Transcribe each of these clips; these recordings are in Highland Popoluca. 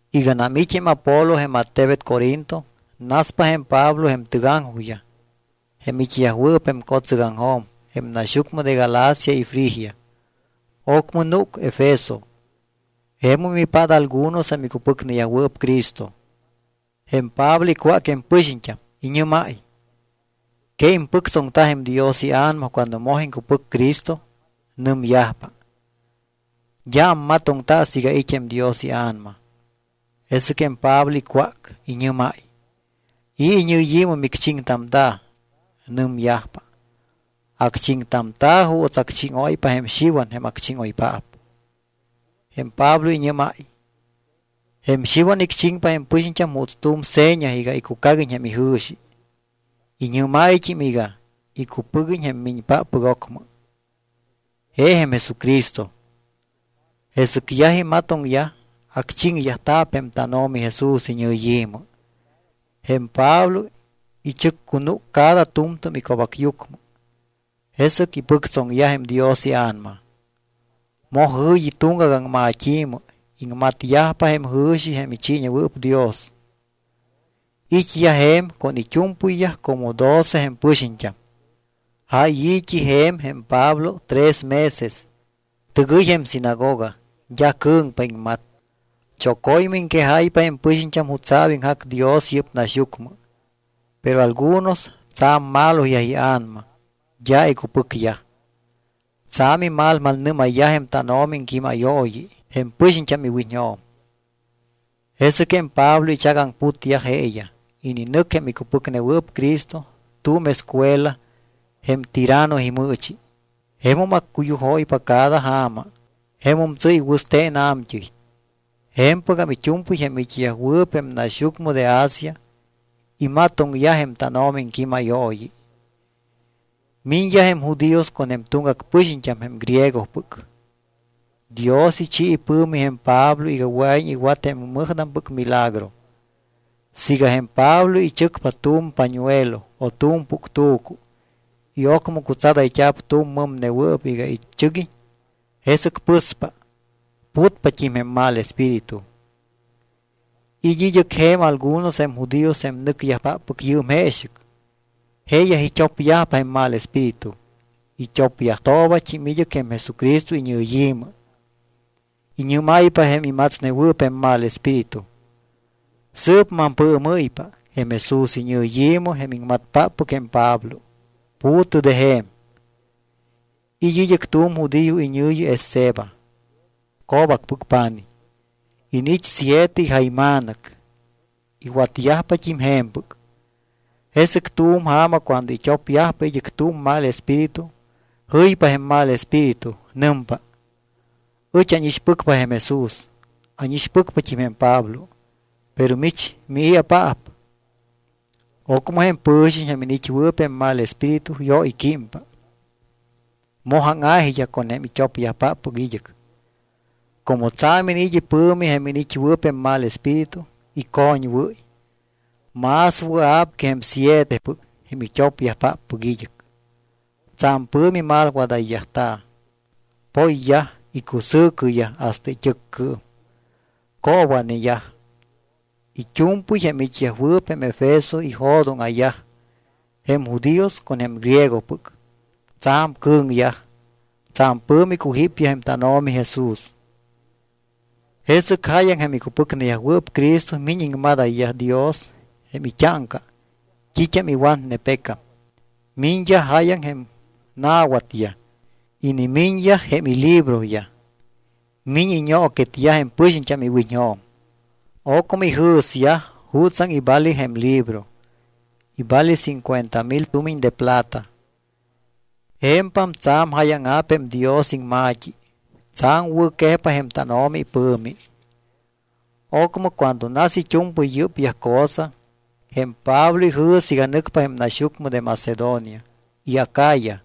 Iganam it́ jém Apolo jém attebet Corinto, naspa jém Pablo jém tɨgaŋjojyaj jém it́yajwɨɨp jém co̱tsɨgaŋjo̱m jém naxyucmɨ de Galacia y Frigia. Ocmɨ núc Efeso. Jemum ipát algunos jém icupɨcneyajwɨɨp Cristo. Jém Pablo icwác jém pɨxiñt́am. Iñɨ́máy: —¿Que impɨctsoŋta jém Dios iA̱nama cuando moj iŋcupɨc Cristo? Nɨmyajpa: —D́a ammatoŋta siiga it́ jém Dios iA̱nama. Jesɨc jém Pablo icwác. Iñɨ́máy: —¿I̱ iñɨyi̱mɨ micchiŋtamta̱? Nɨmyajpa: —Acchiŋtamta̱ juuts acchíŋóypa jém Xiwan jém acchíŋoypaap. Jém Pablo iñɨ́máy: —Jém Xiwan icchiŋpa jém pɨxiñt́am juuts tu̱m seña iga icucaguiñ jém ijɨ̱xi. Iñɨ́máyt́im iga icupɨguiñ jém miñpáppɨc ocmɨ, je jém Jesucristo. Jesɨc yaj imatoŋyaj, acchiŋyajta̱p jém tánO̱mi Jesús iñɨyi̱mɨ. Jém Pablo ichɨccunúc cada tu̱mtu̱m ico̱bacyucmɨ, jesɨc ipɨctsoŋyaj jém Dios iA̱nama. Moj jɨ̱yi tuŋgac aŋmat́i̱mɨ. Iŋmatyajpa jém jɨ̱xi jém ichiiñewɨɨp Dios. It́yaj je̱m con it́u̱mpɨyyaj como doce jém pɨxiñt́am. Jáy i̱t́i je̱m jém Pablo tres meses. Tɨgɨy jém sinagoga, d́a cɨ̱ŋpa iŋmat. Choco̱ymɨ iŋquejáypa jém pɨxiñt́am jutsa̱p iŋjac Dios yɨ́p naxyucmɨ. Pero algunos tsa̱m maloyaj ia̱nama, d́a icupɨcyaj. Tsa̱m imalmalnɨ́mayyaj jém tánO̱mi iŋquímayooyi jém pɨxiñt́am iwiñjo̱m. Jesɨc jém Pablo ichagaŋputyaj jeeyaj. Ininɨc jém icupɨcnewɨɨp Cristo tu̱m escuela jém Tiranno imɨɨchi. Jemum accuyujóypa cada ja̱ma. Jemum tsɨ́y wɨste̱n a̱mt́ɨy. Je̱mpɨgam it́u̱mpɨy jém it́yajwɨɨp jém naxyucmɨ de Asia imatoŋyaj jém tánO̱mi iŋquímayooyi. Miñyaj jém judíos con jém tuŋgac pɨxiñt́am jém griegopɨc. Dios ichi ipɨ̱mi jém Pablo iga wɨa̱iñ iwat jém mɨjtampɨc milagro. Siiga jém Pablo ichɨcpa tu̱m pañuelo o tu̱m puctu̱cu y ocmɨ cutsadayt́a̱p tu̱m mɨmnewɨɨp iga ichɨguiñ, jesɨc pɨspa. Putpat́im jém mal espíritu. It́ id́ɨc je̱m algunos jém judíos jém nɨcyajpáppɨc yɨɨm jeexɨc, jeeyaj it́opyajpa jém mal espíritu. It́opyajtoobat́im id́ɨc jém Jesucristo iñɨyi̱mɨ. Iñɨ́máypa jém imatsnewɨɨp jém mal espíritu: —Sɨɨp mampɨɨmɨ́ypa. Jém Jesús iñɨyi̱mɨ jém iŋmatpáppɨc jém Pablo, pu̱tɨ de je̱m. It́ id́ɨc tu̱m judío iñɨ̱yi Esceva, co̱bacpɨc pa̱nij. Iniit́ siete ijayma̱nɨc, iwatyajpat́im je̱mpɨc. Jesɨc tu̱m ja̱ma cuando it́opyajpa id́ɨc tu̱m mal espíritu, jɨypa jém mal espíritu, nɨmpa: —Ɨch ánixpɨcpa jém Jesús. Ánixpɨcpat́im jém Pablo. Pero mich, ¿mii̱apaap? Ocmɨ jém pɨ̱xiñ jém iniit́wɨɨp jém mal espíritu yóyquímpa, moj áŋa̱jiyaj con jém it́opyajpáppɨc id́ɨc. Como tsa̱m iniit́ ipɨ̱mi jém iniit́wɨɨp jém mal espíritu, icoñwɨ́y; más wɨa̱p que jém sietepɨc, jém it́opyajpáppɨc id́ɨc. Tsa̱m pɨ̱mi malwadayyajta̱. Poyyaj icusɨ̱cɨyaj hasta it́ɨccɨɨm, coowa̱neyaj. It́u̱mpɨy jém it́yajwɨɨp jém Efeso ijo̱dóŋa̱yaj, jém judíos con jém griegopɨc. Tsa̱m cɨ̱ŋyaj. Tsa̱m pɨ̱mi icujípyaj jém tánO̱mi Jesús. Jesɨc jáyaŋ jém icupɨcneyajwɨɨp Cristo miñ iŋmadáyayyaj Dios jém it́áŋca t́it́am iwatne pecam. Miñyaj jáyaŋ jém na̱watyaj. Inimiñyaj jém ilibroyaj. Miñ iñooquetyaj jém pɨxiñt́am iwiñjo̱m. Ocmɨ ijɨ̱syaj jutsaŋ ivale jém libro. Ivale cincuenta mil tumiñ de plata. Je̱mpam tsa̱m jáyaŋa̱p jém Dios iŋma̱t́i, tsa̱m wɨ̱quejpa jém tánO̱mi ipɨ̱mi. Ocmɨ cuando nas it́u̱mpɨy yɨ́pyaj cosa, jém Pablo ijɨ̱s iga nɨcpa jém naxyucmɨ de Macedonia y Acaya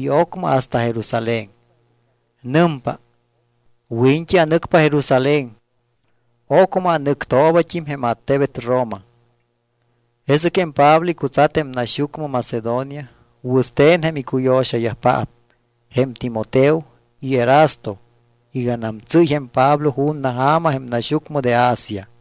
y ocmɨ hasta Jerusalén. Nɨmpa: —Wiñt́i anɨcpa Jerusalén, ocmɨ anɨctoobat́im jém attebet Roma. Jesɨc jém Pablo icutsat jém naxyucmɨ Macedonia wɨste̱n jém icuyo̱xayajpaap jém Timoteo y Erasto iganam tsɨ́y jém Pablo ju̱na ja̱ma jém naxyucmɨ de Asia.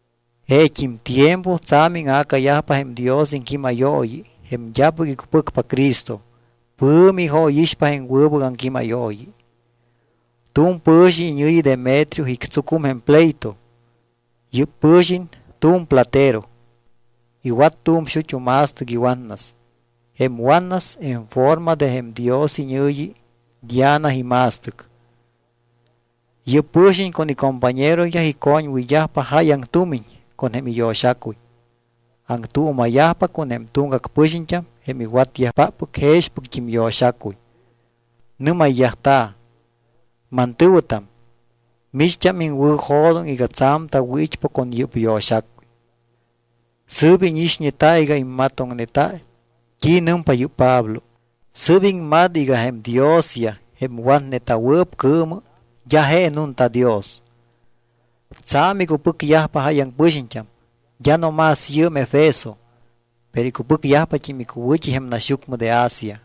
Jeet́im tiempo tsa̱m íŋa̱cayajpa jém Dios iŋquímayooyi. Jém d́apɨc icupɨcpa Cristo pɨ̱mi ijóyixpa jém wɨbɨc aŋquímayooyi. Tu̱m pɨ̱xiñ iñɨ̱yi Demetrio ictsucum jém pleito. Yɨ́p pɨ̱xiñ tu̱m platero, iwat tu̱m xut́u ma̱stɨc iwatnas. Jém watnas en forma de jém dios iñɨ̱yi Diana ima̱stɨc. Yɨ́p pɨ̱xiñ con icompañeroyaj icoñwɨyyajpa jáyaŋ tumiñ con jém iyo̱xacuy. Aŋtuuma̱yajpa con jém tuŋgac pɨxiñt́am jém iwatyajpáppɨc jexpɨct́im yo̱xacuy, nɨ́mayyajta̱: —Mantɨ̱wɨtam, micht́am iŋwɨ̱jo̱doŋ iga tsa̱m tawɨ̱it́pa con yɨ́p yo̱xacuy. Sɨ́p íñixñeta y immatoŋneta t́i nɨmpa yɨ́p Pablo. Sɨ́p iŋmat iga jém diosyaj, jém watneta̱wɨɨp cɨɨmɨ, d́a je nunta dios. Tsa̱m icupɨcyajpa jáyaŋ pɨxiñt́am, d́a no más yɨɨm Efeso, pero icupɨcyajpat́im icuwɨ̱t́i jém naxyucmɨ de Asia.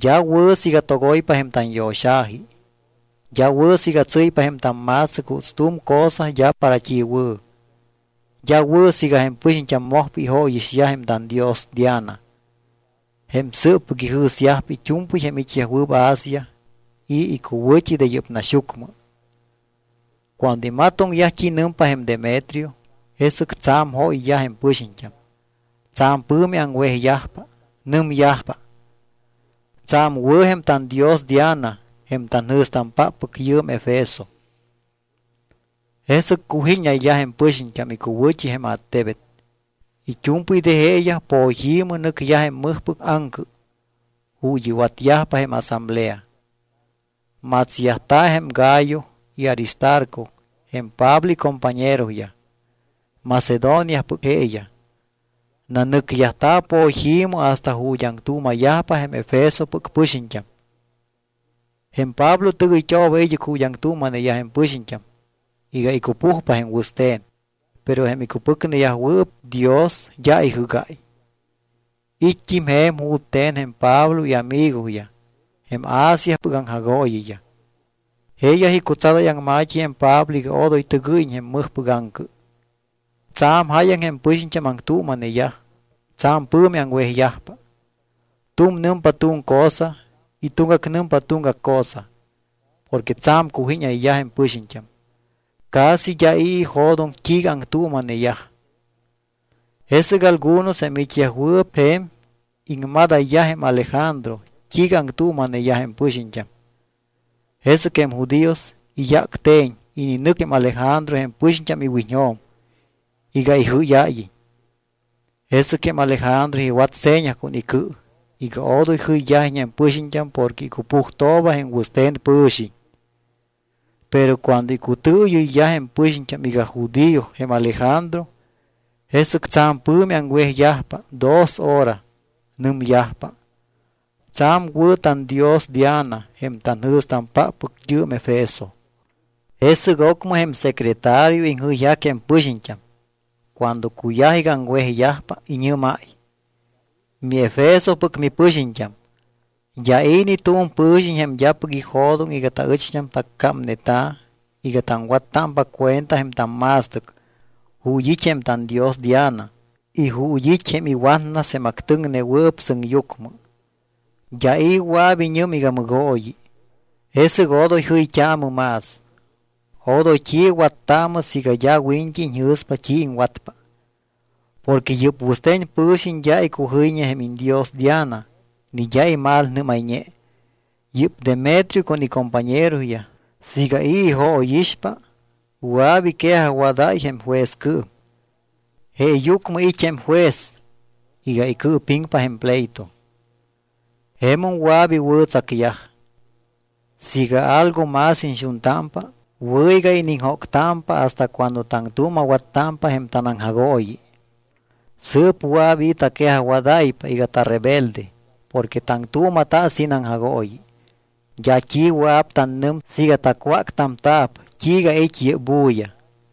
D́a wɨ̱ siiga togoypa jém tanyo̱xa̱ji. D́a wɨ̱ siiga tsɨ́ypa jém tamma̱stɨc juuts tu̱m cosa d́a para t́i wɨ̱. D́a wɨ̱ siiga jém pɨxiñt́am mojpa ijóyixyaj jém tandios Diana, jém sɨɨppɨc ijɨ̱syajpa it́u̱mpɨy jém it́yajwɨɨp Asia y icuwɨ̱t́i de yɨ́p naxyucmɨ. Cuando imatoŋyaj t́i nɨmpa jém Demetrio, jesɨc tsa̱m jóyyaj jém pɨxiñt́am. Tsa̱m pɨ̱mi aŋwejyajpa. Nɨmyajpa: —Tsa̱m wɨ̱ jém tandios Diana, jém tanjɨ̱stampáppɨc yɨɨm Efeso. Jesɨc cujíñayyaj jém pɨxiñt́am icuwɨ̱t́i jém attebet. It́u̱mpɨy de jeeyaj poyi̱mɨ nɨcyaj jém mɨjpɨc aŋcɨ ju̱t́ iwatyajpa jém asamblea. Matsyajta̱ jém Gayo y Aristarco jém Pablo icompañeroyaj, Macedoniapɨc jeeyaj. Nanɨcyajta̱ poyi̱mɨ hasta ju̱t́ aŋtuuma̱yajpa jém Efesopɨc pɨxiñt́am. Jém Pablo tɨgɨyt́ooba id́ɨc ju̱t́ aŋtuuma̱neyaj jém pɨxiñt́am iga icupujpa jém wɨste̱n. Pero jém icupɨcneyajwɨɨp Dios d́a ijɨ́gáy. It́t́im je̱m jute̱n jém Pablo iamigoyaj, jém Asiapɨc aŋjagooyiyaj. Jeeyaj icutsadáy aŋma̱t́i jém Pablo iga odoy tɨgɨ́yiñ jém mɨjpɨc aŋcɨ. Tsa̱m jáyaŋ jém pɨxiñt́am aŋtuuma̱neyaj, tsa̱m pɨ̱mi aŋwejyajpa. Tu̱m nɨmpa tu̱m cosa y tuŋgac nɨmpa tuŋgac cosa. Porque tsa̱m cujíñayyaj jém pɨxiñt́am. Casi d́a i̱ ijo̱doŋ t́iiga aŋtuuma̱neyaj. Jesɨc algunos jém it́yajwɨɨp je̱m iŋmadayyaj jém Alejandro t́iiga aŋtuuma̱neyaj jém pɨxiñt́am. Jesɨc jém judíos iyácte̱ñ ininɨc jém Alejandro jém pɨxiñt́am iwiñjo̱m iga ijɨ́yáyiñ. Jesɨc jém Alejandro iwat seña con icɨ iga odoy jɨyyajiñ jém pɨxiñt́am porque icupujtooba jém wɨste̱n pɨ̱xiñ. Pero cuando icutɨɨyɨyyaj jém pɨxiñt́am iga judío jém Alejandro, jesɨc tsa̱m pɨ̱mi aŋwejyajpa dos hora. Nɨmyajpa: —Tsa̱m wɨ̱ tandios, Diana, jém tanjɨ̱stampáppɨc yɨɨm Efeso. Jesɨc ocmɨ jém secretario iŋjɨyjac jém pɨxiñt́am. Cuando cuyaj iga aŋwejyajpa, iñɨ́máy: —MiEfesopɨc mipɨxiñt́am, d́a i̱ ni tu̱m pɨ̱xiñ jém d́apɨc ijo̱doŋ iga taɨcht́am taccámneta̱ iga taŋwattámpa cuenta jém tamma̱stɨc ju̱t́ it́ jém tandios Diana y ju̱t́ it́ jém iwatnas jém actɨŋnewɨɨp sɨŋyucmɨ. D́a i̱ wɨa̱p iñɨm iga mɨgooyi. Jesɨc odoy jɨyt́aamɨ más. Odoy t́i wattaamɨ siiga d́a wiñt́i iñjɨ̱spa t́i iŋwatpa. Porque yɨ́p wɨste̱n pɨ̱xiñ d́a icujɨyñe jém iñdios Diana ni d́a imalnɨ́mayñe. Yɨ́p Demetrio con icompañeroyaj siiga i̱ ijóyixpa, wɨa̱p iquejajwadáy jém juezcɨɨm. Jeeyucmɨ it́ jém juez iga icɨɨpiŋpa jém pleito. Jemum wɨa̱p iwɨ̱tsacyaj. Siiga algo más iñxuntámpa, wɨ̱ iga iniŋjóctámpa hasta cuando taŋtuuma̱wattámpa jém tanaŋjagooyi. Sɨɨp wɨa̱p i̱ taquejajwadáypa iga tarebelde porque taŋtuuma̱ta sin aŋjagooyi. D́a t́i wɨa̱p tannɨm siiga tacwáctamta̱p t́iiga it́ yɨ́p bulla.